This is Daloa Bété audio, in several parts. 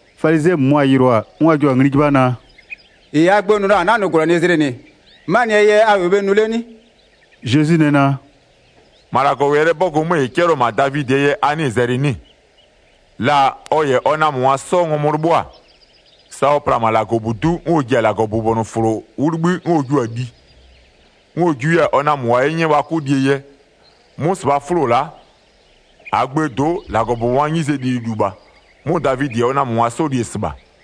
Falizɩɛ -mʋmʋa yɩlʋa-a, 'n wa jua-a ngli 'jɩbha naa: “-Ɩ -aa gbö nʋ la-a -a 'na-a nʋ -gwlɛnɩzlɩ -nɩ, 'manɩɛ yɛ a -wʋɩ bhe nʋ 'le 'nɩ?” Zezwi nɛ naa: “-Ma -Lagɔwɛlɩɛ 'bɔgʋ 'mö -ɩ 'cɛlɩɔ-ɔ -ma Davidɩɛ yɛ a 'nɩɩ-ɩ zɛlɩ 'nɩ-ɩ? La ɔ -yɛ ɔ namöngwa 'sɔ ngɔmʋ 'lɩbhʋa-a, sa ɔ pla-a -ma -Lagɔbudu'u 'n ɔ ji-a -Lagɔbʋbɔnʋfʋlo 'wʋ 'libhï 'n ɔ jiʋ-a li, 'n ɔ jiʋ 'yɛ-a ɔ namöngwa 'ye 'nyɛ wa 'kʋ lie yɛ. 'Mʋ -sɩbhaa 'fʋlo la'a, -aa gböö do'o, -Lagɔbʋbɔngwaa 'nyizee lililu la -bha. 'Mʋ Davidɩ -yɛ ɔ namöngwa 'sɔ li-e -sɩbha.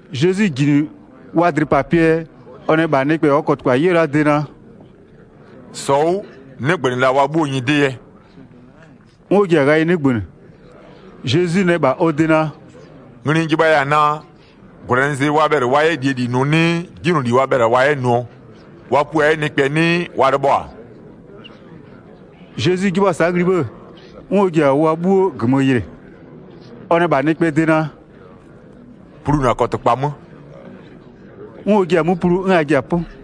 Zezwi -ji -nɩ wa dlɩpapɩɛ yɛ, ɔ nɛ -bha nɩkpɛ -ɔɔ kɔtɩkpa 'yɛɔ la-aa de naa: “-Sɔ 'wʋ 'nɩgbö -la wa 'bhuoo nyɩdɩ yɛ.” 'N ɔ ji-a ghayɩ 'nɩgbönɩ. Zezwi nɛ -bha wa de naa: “Ngli n jɩbhaya-a naa: -Gwlɛnɩzlɩ, wa bhɛlɩ wa 'yɛ -lie -li nʋ 'nɩɩ 'jinyloli wa bhɛlɩ-a wa yɛ nʋɔ? Wa pua 'yɛ nɩkpɛ 'nɩɩ wa lɩbhɔ-a?” Zezwi 'jɩbhʋa-a sa'a ngli 'bhë, 'n ɔ ji-a wa 'bhuo -gömö yɩlɩ. Ɔ nɛ -bha nɩkpɛɛ de naa: “Plu na kɔtɩkpa 'mö.” 'N ɔ jia-a 'mö plu 'n a ji-a 'pʋ.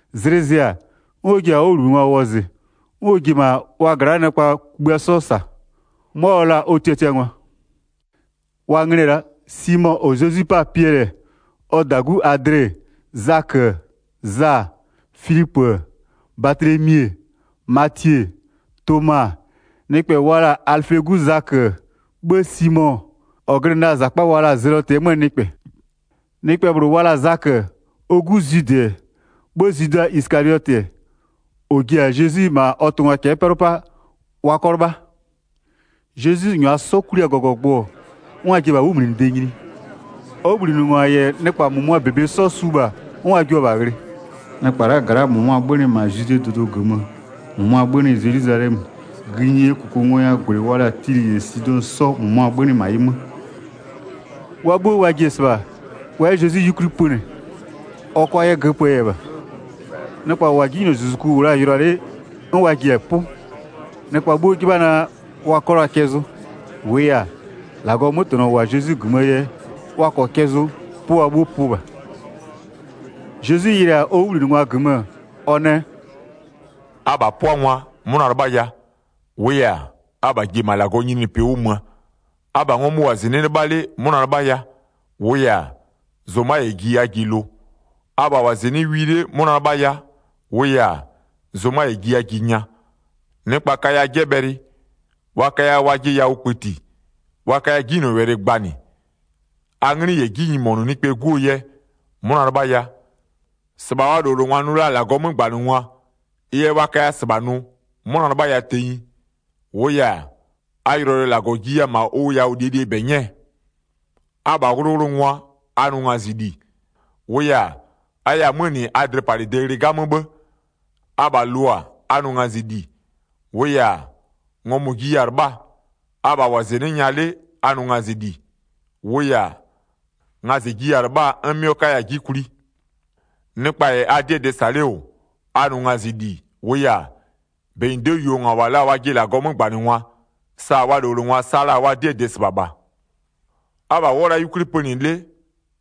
Zlɩ zɩ-a, 'n ɔ ji-a ɔ 'wʋbhlinɩngwa wɔzɩ, 'n ɔ ji-e -ma wa gla'aa nɩkpa kugbïa 'sɔ -sa, 'mʋa ɔ la-a ɔ tiatiangwa. Wa nglɩ-ɛ la'a: Simo -ɔ Zezwi 'pa-a Piɛlɩ-ɛ, ɔ -dagu Adle-e, Zakö-ö, Za-a, Filipö-ö, Batlemi-e, Matie-e, Toma-a, nɩkpɛ wa la-a Alɩfee 'gu Zakö-ö, 'bhë Simo -ɔ glɩnɩ la-a -zakpa wa la-a zelɔtɩ 'möö nɩkpɛ. Nɩkpɛ -bhlʋ wa la-a Zakö, ɔ 'gu Zwidɩ-ɛ, 'bhë Zwida Isɩkaliɔtɩ -ɔ ji-a Zezwi -ma ɔ tʋngwa cɛ'ɛ 'pɛlʋ 'paa wa 'kɔ 'lɩbha. Zezwi -nyʋa 'sɔ kwli-a -gɔgɔgbʋ, 'n wa ji-a 'wʋmlinɩde nyini. Ɔ 'wʋbhlinɩngwa -yɛ nɩkpa -mʋmʋaa -bebe 'sɔ su -bha 'n wa jua-a -bha ghlɩ. Nɩkpa la'aa gla'aa -mʋmʋa 'bhönɩ -ma Zwidee dʋdʋ -gömö, -mʋmʋa 'bhönɩ Zelwizalɛmö, gïnyie -kʋkʋngɔyawʋɔ -gwlɩ wa la-a Tilɩ -yɛ Sidɔ 'sɔ -mʋmʋa 'bhönɩ -ma ɩ 'mö. Wa 'bhuo wa ji-e -sɩbha, wa 'yɛ Zezwi 'yukwli pönɩ, ɔ 'kʋa 'yɛ göpöö yɛ -bha. Nɩkpa -wa 'jinylozuzuku -wʋ la-a yʋlʋa 'le 'n wa ji-a 'pʋ. Nɩkpa 'bhuo 'jɩbha naa wa 'kɔ la cɛ zʋ. -Wʋʋ yɛ-a, -Lagɔɔ 'mötɛnɔ -wʋ-a Zezwi -gömöö yɛ, -wa -kɔɔ cɛ zʋ 'pʋ wa 'bhuo pʋ -bha. Zezwi yɩlɩ-a ɔ 'wʋbhlinɩngwa -gömö ɔ nɛ: “Abha 'pʋangwa, 'mʋna 'lɩbhaya, -wʋʋ yɛ-a, abha ji-e -ma -Lagɔɔ nyininyinipɩ 'wʋ möö. Abha ngɔmʋ -wʋ-a -zɩnɩ'ɩ 'lɩbha 'le 'mʋna 'lɩbhaya, -wʋʋ yɛ-a, zʋma -yɛ ji a ji lʋ. Abha -wʋ-a -zɩnɩ'ɩ wi 'le 'mʋna 'lɩbhaya, -wʋʋ yɛ-a, zʋma -yɛ ji a ji nya. Nɩkpa kaya 'jɛbhɛlɩ, wa kaya wajɩ yawʋ kpëti, wa kaya 'jinylɔwɛlɩ gbanɩ, a 'nglɩ -yɛ 'ji nyimonʋ Nɩkpɛɛ 'Guo yɛ, 'mʋna 'lɩbhaya. 23-Sɩbha wa -lowlengwa nʋ la-a -Lagɔɔ 'mögbanɩngwa, ɩ yɛ wa kaya -sɩbha nʋ, 'mʋna 'lɩbhaya tenyi, -wʋʋ yɛ-a, a yʋlɔyʋlɔ yɛ -Lagɔ jiya-a -ma ʋ yawʋ -lie -lie -bebe 'nyɛɛ. Abha 'wʋlʋwʋlʋngwa, a nʋ ngazɩli, -wʋʋ yɛ-a, a yɛ-a 'mö -nɩ a dlɩpalɩde ghlɩ 'gamö 'bhë. Abha lʋ-a, a nʋ ngazɩli, -wʋʋ yɛ-a, ngɔmʋ-ʋ jiya-a 'lɩbhaa. Abha -wʋ-a -zɩnɩ'ɩ nya 'le a nʋ ngazɩli, -wʋʋ yɛ-a, ngazɩ jiya-a 'lɩbhaa 'n 'mɩɔ 'kaya-a 'ji kwli. Nɩkpa -yɛ a 'dɩɛ dɩ -sa 'le -wʋ, a nʋ ngazɩli, -wʋʋ yɛ-a, -benyido'oo yuongwa -wa la-a wajɩ -Lagɔɔ 'mögbanɩngwa, sa wa -lowlengwa sa la-a wa 'dɩɛ dɩ -sɩbha -bha. Abha wʋ'ʋ-ɔ la'a 'yukwli pönɩ 'le,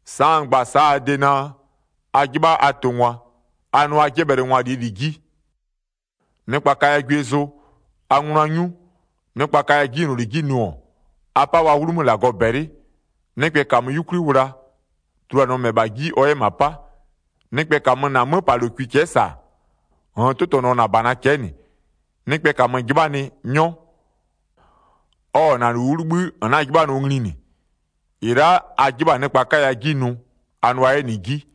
sa'a n gba-a sa'a a de naa, a 'jɩbha a tʋngwa, a nʋ a 'jɛbhɛlɩngwa -lie -li 'ji. Nɩkpa kaya gwie zʋ, a ngʋnʋa 'nyu, nɩkpa kaya 'jinyloli 'ji nʋ-ɔ, a 'pa wa 'wlumö -Lagɔ -bɛlɩ. Nɩkpɛ -kamö 'yukwli wla, tuluanɩɔ -mɛbha 'ji ɔ 'yɛ -ma 'pa. Nɩkpɛ -kamö -na 'möpalokwi cɛ'ɛ -sa, -nn 'tʋtɔnʋɔ -na -bana cɛ'ɛ -nɩ. Nɩkpɛ -kamö 'jɩbhanɩ, 'nyɔ. Ɔ-ɔ -na -lu 'wʋ 'libhï -n 'na-a 'jɩbhanɩɔ ngli -nɩ. 31-Ɩ la'a a 'jɩbha-a nɩkpa 'kaya 'ji nʋ, a nʋa 'yɛ -nɩ 'ji.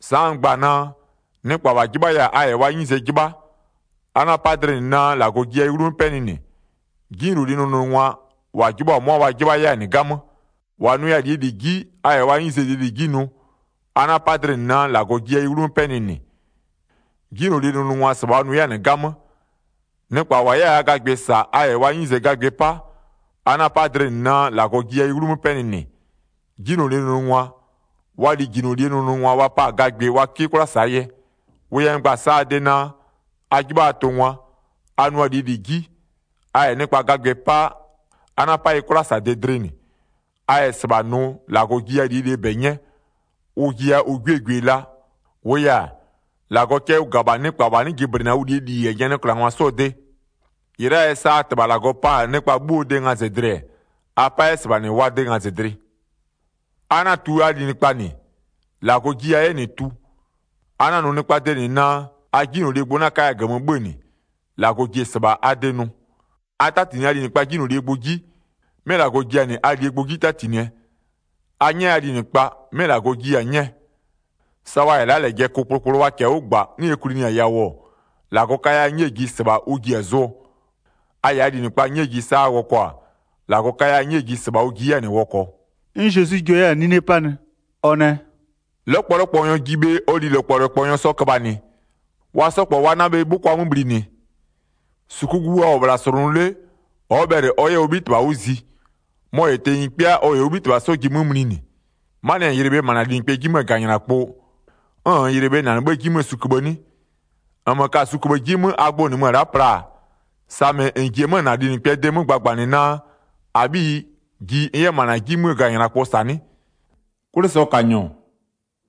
Sa'a n gba-a naa, nɩkpa -wa 'jɩbhaya-a a -yɛ wa 'nyize 'jɩbha, a 'na-a 'pa dlɩ -nɩ naa -Lagɔ jiya ɩ 'wlumö 'pɛnɩ -nɩ, 'jinylolie nʋnʋngwa, -wa 'jɩbhʋa-a 'mʋa wa 'jɩbha 'yɛ-a -nɩ 'gamö. 33-Wa -nʋya-a -lie -li 'ji, a -yɛ wa 'nyize lie -li 'ji nʋ, a 'na-a 'pa dlɩ -nɩ naa -Lagɔ jiya ɩ 'wlumö 'pɛnɩ -nɩ, 'jinylolie nʋnʋngwa -sɩbha wa nʋ 'yɛ-a -nɩ 'gamö. Nɩkpa -wa 'yɛ-a gagbɩ -sa a -yɛ wa 'nyize gagbɩ 'pa, a 'na-a 'pa dlɩ -nɩ naa -Lagɔ jiya ɩ 'wlumö 'pɛnɩ -nɩ. 'Jinylolie nʋnʋngwa, wa lijinylolie nʋnʋngwa wa pa-a gagbɩ wa 'kɩ 'kwla -saa yɛ. Wʋ yɛ n gba-a sa'a a de naa, a 'jɩbha a tʋngwa, a nʋa lie -li 'ji, a -yɛ nɩkpa gagbɩ 'pa, a 'na-a 'pa ɩ 'kwlasade dlɩ -nɩ, a -yɛ -sɩbha nʋ -Lagɔ jiya -lie -bɛ 'nyɛ, ʋ jiya ʋ 'gwiee gwie la, -wʋʋ yɛ-a, -Lagɔ cɛ ʋ -ga-a -bha nɩkpa -wa 'nɩ jɩblɩnɩ-a ʋ -lie -li -yɛ nyanɩklangwa 'sɔɔ de. 36-Ɩ la'aa yɛ sa a -Tɩbha -Lagɔ pa-a nɩkpa 'bhuoo de ngazɩdlɩ-ɛ, a 'pa 'yɛ -sɩbha -nɩ wa de ngazɩdlɩ. A 'na-a tu a linɩkpa -nɩ, -Lagɔ jiya-a 'yɛ -nɩ tu. A 'na-a nʋ nɩkpaa de -nɩ naa, a 'jinylolie gbʋ 'na 'kaya -gömö 'bhö-ö -nɩ, -Lagɔ ji-e -sɩbha a de nʋ. A 'tatinɩ a linɩkpaa 'jinylolie gbʋ 'ji, 'mɩ -Lagɔ ji a -nɩ -lie gbʋ 'ji 'tatinɩ. A 'nyɛ a linɩkpa, 'mɩ -Lagɔ jiya-a 'nyɛɛ, sa wa -yɛ la'a -lɛjɛ kʋ kplokplo wa -kɛɛ 'wʋ -gba, 'n ɛ kwlinɩ-a yawʋ-ɔ, -Lagɔ kaya 'nyɛɛ ji -sɩbha ʋ ji-a zʋɔ, a -yɛ a linɩkpa 'nyɛɛ ji sa a wɔkɔ-a, -Lagɔ kaya 'nyɛɛ ji -sɩbha ʋ ji 'yɛ-a -nɩ wɔkɔɔ.” 'N Zezwi jua 'yɛ-a 'nine 'panɩ, ɔ nɛ: “'Lɔkpɔlɔkpɔnyɔ ji bhe ɔ lilɔkpɔlɔkpɔnyɔ sɔ köbhanɩ? Wa 'sɔ -kpɔ wa 'na bhe 'bhʋkwa 'mö bhlinɩ? 40-Sukugu wa -wʋ-ɔ -bhla -slʋnʋ 'le, ɔ'ɔ bhɛlɩ ɔ 'yɛ ɔ 'bhitɩbha 'wʋ zi, mɔ-ɔ -yɛ tenyi 'kpɩa ɔ -yɛ ɔ 'bhitɩbha 'sɔ ji 'mö mlinɩ. 'Manɩɛ yɛ -n yɩlɩ bhe -ma -na linɩkpɛɛ 'ji 'möö -ganylakpʋ 'n -nn yɩlɩ bhe -ma -na -nɩ 'bhëë 'ji 'möö suköbhë 'nɩ? 42-Nmö ka-a suköbhë 'ji 'mö a gbʋ -nɩmö-ö la'a pla-a, samɩ -n ji-e -na linɩkpɛɛ de 'mö gbagbanɩ naa, -abhiyi, ji n 'yɛ -ma -na 'ji 'mö -ganylakpʋ -sa 'nɩ? 'Kwlɩsɔkanyɔ,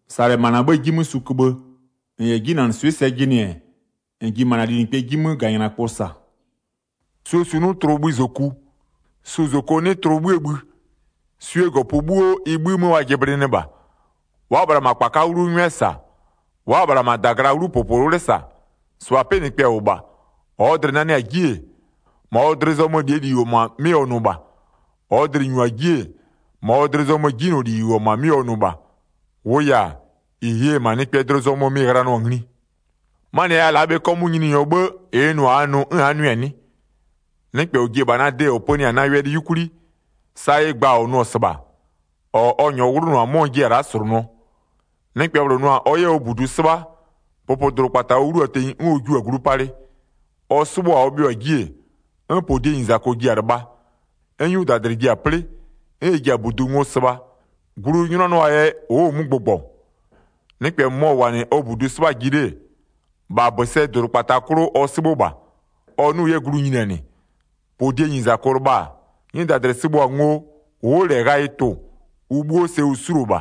-sa -lɛ -ma -na 'bhëë 'ji 'mö suköbhë, -n -yɛ 'jinanɩswɩ'ɩ sɛ jɩnɩ-ɛ, -n ji -ma -na linɩkpɛɛ 'ji 'mö -ganylakpʋ -sa. Suo su 'nɩ tlʋ bhï -zoku, su -zoko 'nɩ tlʋ 'bhïë bhï. Swie -gɔpö 'bhuo ɩ 'bhï 'mö wa jɩblɩnɩɩ -bha, wa'a-a -bhla -ma -kpaka 'wlu 'ngwɛ -sa, wa'a-a -bhla -ma -dagla 'wlu -popowle -sa. 45-Sɩbha 'pɩnɩkpɛ -wʋ -bha, -ɔɔ dlɩ-ɩ nanɩ-a 'ji-e, -ma ɔ dlɩ zɔmö -lie -li -wʋ-ɔ -ma 'mɩ ɔ nʋ -bha, -ɔɔ dlɩ-ɩ -nyu-a 'ji-e, -ma ɔ dlɩ zɔmö 'jinyloli -ɩ -wʋ-ɔ -ma 'mɩ ɔ nʋ -bha. -Wʋʋ yɛ-a, -ɩ ye-e -ma nɩkpɛɛ dlɩ zɔmö mɩ-ɩ ghlanɩɔ-a ngli. 'Manɩɛ yɛ a la'a bhe 'kɔmʋʋ a Nyininyɔ 'bhë -ɩ n nʋ-a a nʋ 'n a'a nʋɩ-a 'nɩ? Nɩkpɛ -ɔ ji-e -bha na de -ɔ pönɩ-a na wɛlɩ 'yukwli, sa ɩ gba-a ɔ nʋ-ɔ -sɩbha, -ɔ ɔ -nyɔɔ 'wlʋnʋ-a 'mɔ n jiya-a la'a -slʋnʋɔ. Nɩkpɛ -bhlʋ nʋ-a ɔ 'yɛ ɔ -budu 'sɩbha, pʋpʋdʋdʋkpata ɔ 'wlu-a tenyi 'n ɔ jiʋ-a glu palɩ, ɔ 'sɩbhʋ-a ɔ bhɩʋ-a 'ji-e, 'n -podienyizako ji-a lɩbha, 'n 'nyudadlɩ ji-a 'plɩ, 'n ɩ ji-a -budu ngo sɩbha, glu ʋ 'nyʋnanɩɔ-aa yɛ, ʋ'ʋ-ʋ 'mö gbʋgbɔ. Nɩkpɛ -mʋmɔ -wʋ-a -nɩ ɔ -budu 'sɩbhaa 'ji 'le-e, -bha -bösɛdʋdʋkpata 'klʋ ɔ 'sɩbhʋ -bha. Ɔ 'nʋ-ʋ 'yɛ glu nyinianɩ, -podienyizako lɩbha-a, 'nyudadlɩ sɩbhʋ-a ngo ʋ'ʋ -lɛ ghayɩ tʋ-ʋ, ʋ 'bhuo sɛ ʋ 'suluo -bha.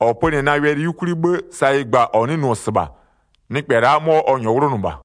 -Ɔ pönɩ-ɛ na wɛlɩ 'yukwli 'bhë, sa ɩ gba-a -ɔ 'nɩ nʋ-ɔ -sɩbha, nɩkpɛ la'a 'mɔ ɔ -nyɔɔ 'wlʋnʋ -bha.”